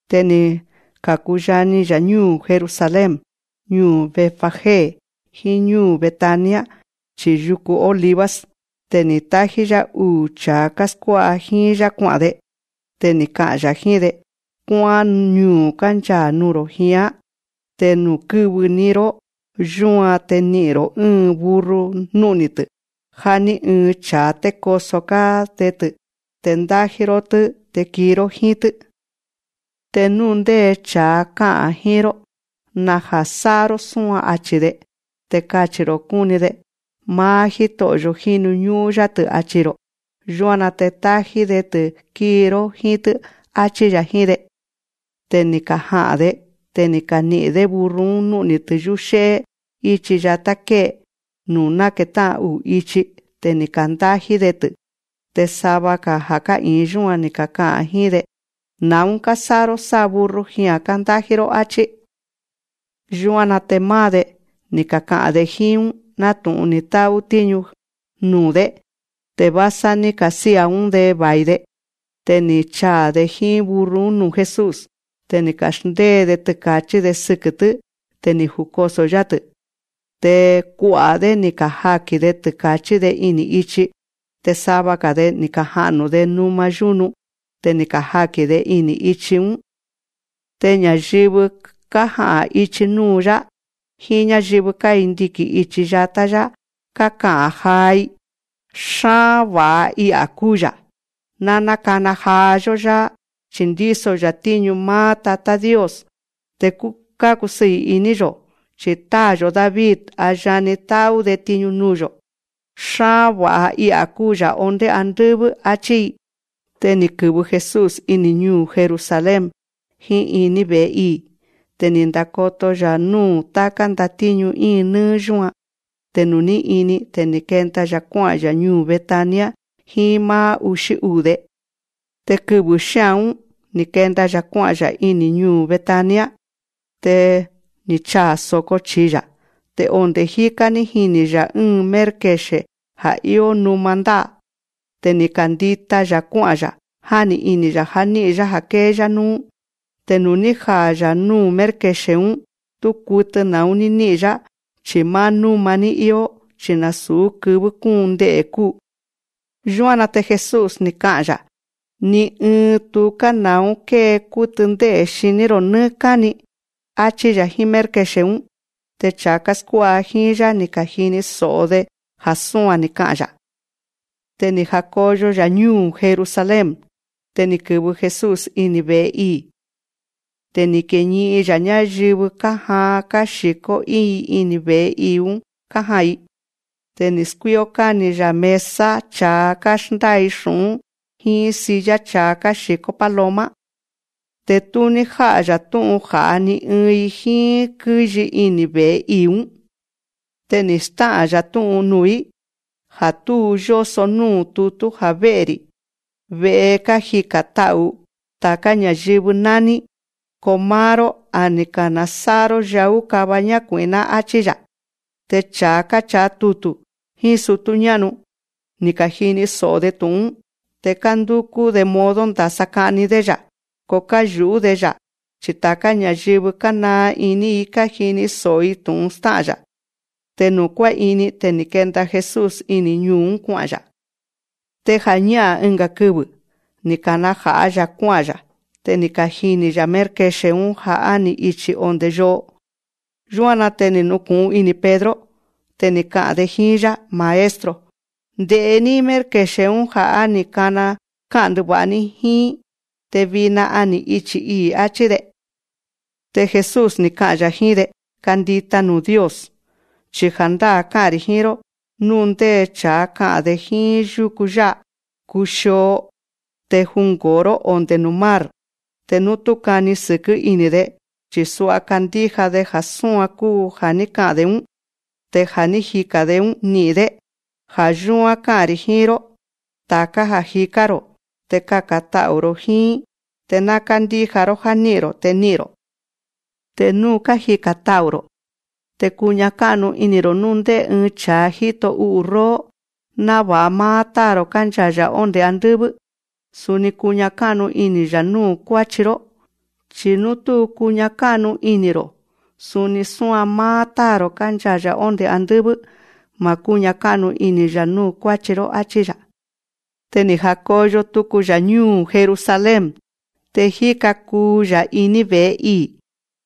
Te ni̱ ka̱kuyani‑ya̱ ñúu̱ Jerusalén, ñuu̱ Betfagé, jíín ñúu̱ Betania, chi̱i yuku Olivos. Te ni̱ tájí‑yá uu̱ cha̱a káskuá'a jíín‑yá kua'a̱n‑de. Te ká'a̱n‑ya̱ jíín‑de: Kuá'án ñuu̱ kánchaa̱ nuu̱‑ro̱ jián. Te nuu̱ kɨ́vɨ‑ni‑ró yúan, te ni'i̱n‑ro̱ ɨ́ɨn burro nú'ni̱‑tɨ̱, ja̱ ní ɨɨn cha̱a té koso‑gá‑de‑tɨ̱. Te ndájí‑ró‑tɨ́, te kii‑ró jíín‑tɨ́. Te nú ndé cha̱a ká'a̱n jíín‑ró: Naja̱ sá'a‑ró súan, achi̱‑de. Te kachi̱‑ro̱ kúni‑de: Máá Jíto'o̱‑yo̱ jínu ñú'ún‑yá‑tɨ̱, achi̱‑ro̱. Yúan‑na te tájí‑ni‑de‑tɨ̱ kíi‑ró jíín‑tɨ́, áchí‑ya̱ jíín‑de. Te ni̱ kaja'a̱n‑de. Te ni̱ kani'i̱n‑dé burro‑ún nú'ni̱‑tɨ̱ yúxé'é íchi yatá ké'e, nuu̱ náketá'an uu̱ ichi. Te ni̱ ka̱ndájí‑de‑tɨ̱. Te sava ja̱ ká'i̱in yúan, ni̱ kaka'a̱n jíín‑de: Na̱ún kásá'a‑ró sá burro jia̱n kándájí‑ró, áchí. Yúan‑na te máá‑de, ni̱ kaka'a̱n‑de jíín‑ún, nátu̱'un ni̱ tá'ú Jesús tiñu nuu̱‑dé. Te vásá ní ka̱sía̱‑ún‑de va̱i‑de. Te ni̱ chaa̱‑de jíín burro‑ún nuu̱ Jesús. Te ni̱ ka̱xndée‑de tɨka̱chí‑de sɨkɨ̱‑tɨ́. Te ni̱ jukoso̱‑yá‑tɨ̱. Te kua'a̱‑dé, ni̱ kajaki̱n‑de tɨka̱chí‑de ini̱ ichi, te sava‑ga̱‑de, ni̱ kaja'nu̱‑de numa yúnu. Te ni̱ kajaki̱n‑de ini̱ ichi‑ún. Te ña̱yɨvɨ kája'a̱n ichi núu̱‑yá, jíín ñáyɨvɨ kándiki̱n ichi yatá‑yá, káka'a̱n jaa‑i: Xáán va̱'a I'a̱ kúu‑ya̱. Ná nákana jaa‑yó‑yá, chi̱ ndíso‑ya̱ tíñu máá Tatá Dios. Te kákusɨɨ̱ iní‑yo̱, chi̱ táa̱‑yo̱ David, a yani tá'ú‑de tiñu nuu̱‑yo̱. Xáán va̱'a I'a̱ kúu‑ya̱ ondé andɨ́vɨ́, áchí‑i. Te ni̱ kɨ̱vɨ Jesús ini̱ ñuu̱ Jerusalén, jíín iní ve̱'e ii̱. Te ni̱ ndakoto‑ya̱ núu̱ táká ndatíñu íin nɨ́ɨ́ yúan. Te nuu̱ ní ini, te ni̱ kenda‑ya̱ kuá'a̱n‑ya̱ ñúu̱ Betania jíín máá uxí uu̱‑de. Te kɨvɨ̱ xía̱n‑ún, ni̱ ka̱kenda‑ya̱ kuá'a̱n‑ya̱ iní ñuu̱ Betania. Te ni̱ chaa̱ so̱ko chi̱i‑ya̱. Te onde̱ jíká ní jini̱‑ya̱ ɨ́ɨn mérkexe̱ ja̱ íó numa ndá'a. Te ni̱ kandita‑ya̱ kuá'a̱n‑ya̱, jáni ini̱‑ya̱ já ní'i̱n‑yá ja̱ kée‑yá núú. Te nuu̱ ní jaa̱‑ya̱ núu̱ mérkexe̱‑ún, tú kutɨ na̱ún ní ní'i̱n‑yá, chi̱ máá núma‑ní íó. Chi̱ nasu̱ kɨvɨ́ kúun nde'e̱ kúu. Yúan‑na te Jesús, ni̱ ka'a̱n‑ya̱: Ni ɨɨn tuká na̱ún kée kútɨ ndé'e̱ xiní‑ro̱ nɨ́ɨ́ káni, áchí‑ya̱ jíín mérkexe̱‑ún. Te cha̱a káskuá'a jíín‑yá, ni̱ ka̱jini so̱'o‑de ja̱ súan ni̱ ka'a̱n‑ya̱. Te ni̱ ja̱koyo‑ya̱ ñúu̱ Jerusalén. Te ni̱ kɨ̱vɨ Jesús ini̱ ve̱'e ii̱. Te ni̱ kiñi'in‑ya̱ ñáyɨvɨ kájaan káxi̱kó íin‑i ini̱ ve̱'e ii̱‑ún kája'a̱n‑i. Te ni̱ skuíó káni‑ya̱ mesa cha̱a káxndái xu̱'ún, jíín silla cha̱a káxi̱kó paloma. Te tú ní já'a‑ya̱ tú'un ja̱'a ni ɨɨn‑i jíín kɨ́yi ini̱ ve̱'e ii̱‑ún. Te ni̱ stá'a̱n‑ya̱ tú'un nuu̱‑í: Á tú yóso núu̱ tutú ja̱ vé'e‑ri̱, ve'e nuu̱ kájika̱n ta'u̱ táká ña̱yɨvɨ nání. Ko máá‑ró, a ni̱ ka̱nasá'a‑ró yaú kava ñákui̱'ná, áchí‑ya̱. Te cha̱a káchaa tutu̱ jíín sutú ñá'nu, ni̱ ka̱jini so̱'o‑de tu̱'un‑ún. Te kándúkú‑de modo ndasa ka'ni‑dé‑ya̱. Ko káyu̱'ú‑de‑ya̱, chi ta̱ká ña̱yɨvɨ kánaa iní‑i kájini so̱'o‑i tu̱'un stá'a̱n‑ya̱. Te nuu̱ kuá'ini, te ni̱ kenda Jesús ini̱ ñuu̱‑ún, kua'a̱n‑ya̱. Te ja̱ñá'a̱n ɨnga̱ kɨvɨ̱, ni̱ kana̱ja̱'a‑ya̱ kuá'a̱n‑ya̱. Te ni̱ kajini̱‑ya̱ mérkexe̱‑ún ja̱ á ni̱ ichi̱ onde̱ yo'o. Yúan‑na te ni̱ nuku̱'un ini̱ Pedro. Te ni̱ ka'a̱n‑de jíín‑yá: Maestro, nde̱'é‑ní mérkexe̱‑ún ja̱ ní ka'a̱n ndɨva̱'a‑ní jíín. Te vina a ni̱ ichi̱ ii̱, áchí‑de. Te Jesús, ni̱ ka'a̱n‑ya̱ jíín‑de: Kandíja nuu̱ Dios, chi ja̱ndáa̱ ká'a̱n‑ri̱ jíín‑ró: Nú ndé cha̱a ka'a̱n‑de jíín yúku yá'a: Kuxio, te jungo̱o‑ró ondé nuu̱ mar, te nú tú kani sɨ̱kɨ́ ini̱‑de, chi̱ sua kándíja‑de ja̱ súan kuu ja̱ ní ka'a̱n‑de‑ún, te ja̱ ní jika̱n‑de‑ún, ni'i̱n‑dé. Ja̱ yúán ká'a̱n‑ri̱ jíín‑ró: Ta̱ká ja̱ jikán‑ro̱, te kaka̱n ta'u̱‑ro̱ jíín, te ná kándíja‑ró já ní'i̱n‑ro̱, te ni'i̱n‑ro̱. Te nú kájika̱n ta'u̱‑ro̱, te kuña ká'nu ini̱‑ro̱ núu̱ ndé ɨɨn cha̱a jíto u'u̱ róó, náva̱'a máá Táa̱‑ro̱ kánchaa̱‑ya̱ ondé andɨ́vɨ́, suni kuña ká'nu ini̱‑ya̱ núu̱ kuáchi‑ró. Chi̱ nú tú kuña ká'nu ini̱‑ro̱, suni súan máá Táa̱‑ro̱ kánchaa̱‑ya̱ ondé andɨ́vɨ́, ma̱ kúña ká'nu ini̱‑ya̱ núu̱ kuáchi‑ró, áchí‑ya̱. Te ni̱ naja̱koyo tuku‑ya̱ ñúu̱ Jerusalén. Te jíka kuu‑ya̱ iní ve̱'e ii̱.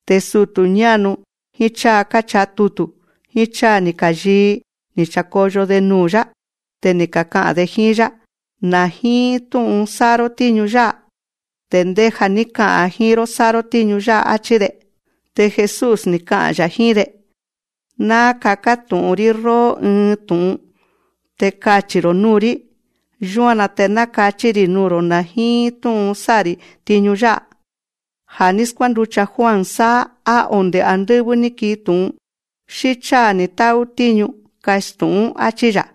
Te sutu̱ ñá'nu, jíín cháa káchaa tutu̱, jíín cháa ni̱ ka̱yii, ni̱ cha̱koyo‑de nuu̱‑yá. Te ni̱ kaka'a̱n‑de jíín‑yá: Na̱ jíín tú'un sá'a‑ró tíñu yá'a. Te ndéja̱ ní ka'a̱n jíín‑ró sá'a‑ró tíñu yá'a, áchí‑de. Te Jesús, ni̱ ka'a̱n‑ya̱ jíín‑de: Ná kaká tu̱'ún‑rí róó ɨɨn tu̱'un, te kachi̱‑ro̱ núu̱‑rí. Yúan‑na te ná kachí‑ri̱ nuu̱‑ro̱ na̱ jíín tú'un sá'a‑ri̱ tiñu yá'a. Ja̱ ní skuánducha Juan sáá, á onde̱ andɨ́vɨ́ ní kii tu̱'un, xí cháa ni̱ tá'ú tíñu. Kastu̱'ún, áchí‑ya̱.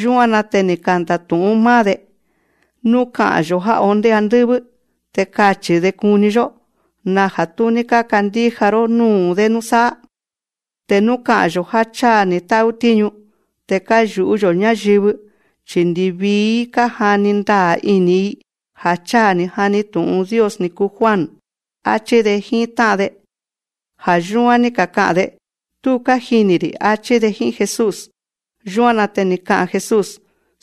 Yúan‑na te ni̱ kanda̱tu̱'ún máá‑de: Nú ka'a̱n‑yo̱: Ja̱ ondé andɨ́vɨ́. Te kachi̱‑de kuni‑yó: Naja̱ tú ní kákandíja‑ró núu̱‑dé núsáá. Te nú ka'a̱n‑yo̱ já cháa ni̱ tá'ú tíñu. Te káyu̱'ú‑yo̱ ñáyɨvɨ, chi̱ ndivii‑í kájani ndaa̱ ini̱‑i ja̱ cháa ni̱ jani tu̱'un Dios ni̱ kuu Juan, áchí‑de jíín tá'an‑de. Ja̱ yúán ní kaka'a̱n‑de: Tú kájini̱‑ri̱, áchí‑de jíín Jesús. Yúan‑na te ni̱ ka'a̱n Jesús: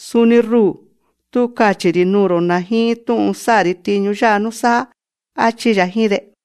Suni ruu̱, tú kachi̱‑ri̱ nuu̱‑ro̱ na̱ jíín tú'un sá'a‑ri̱ tiñu yá'a núsáá, áchí‑ya̱ jíín‑de.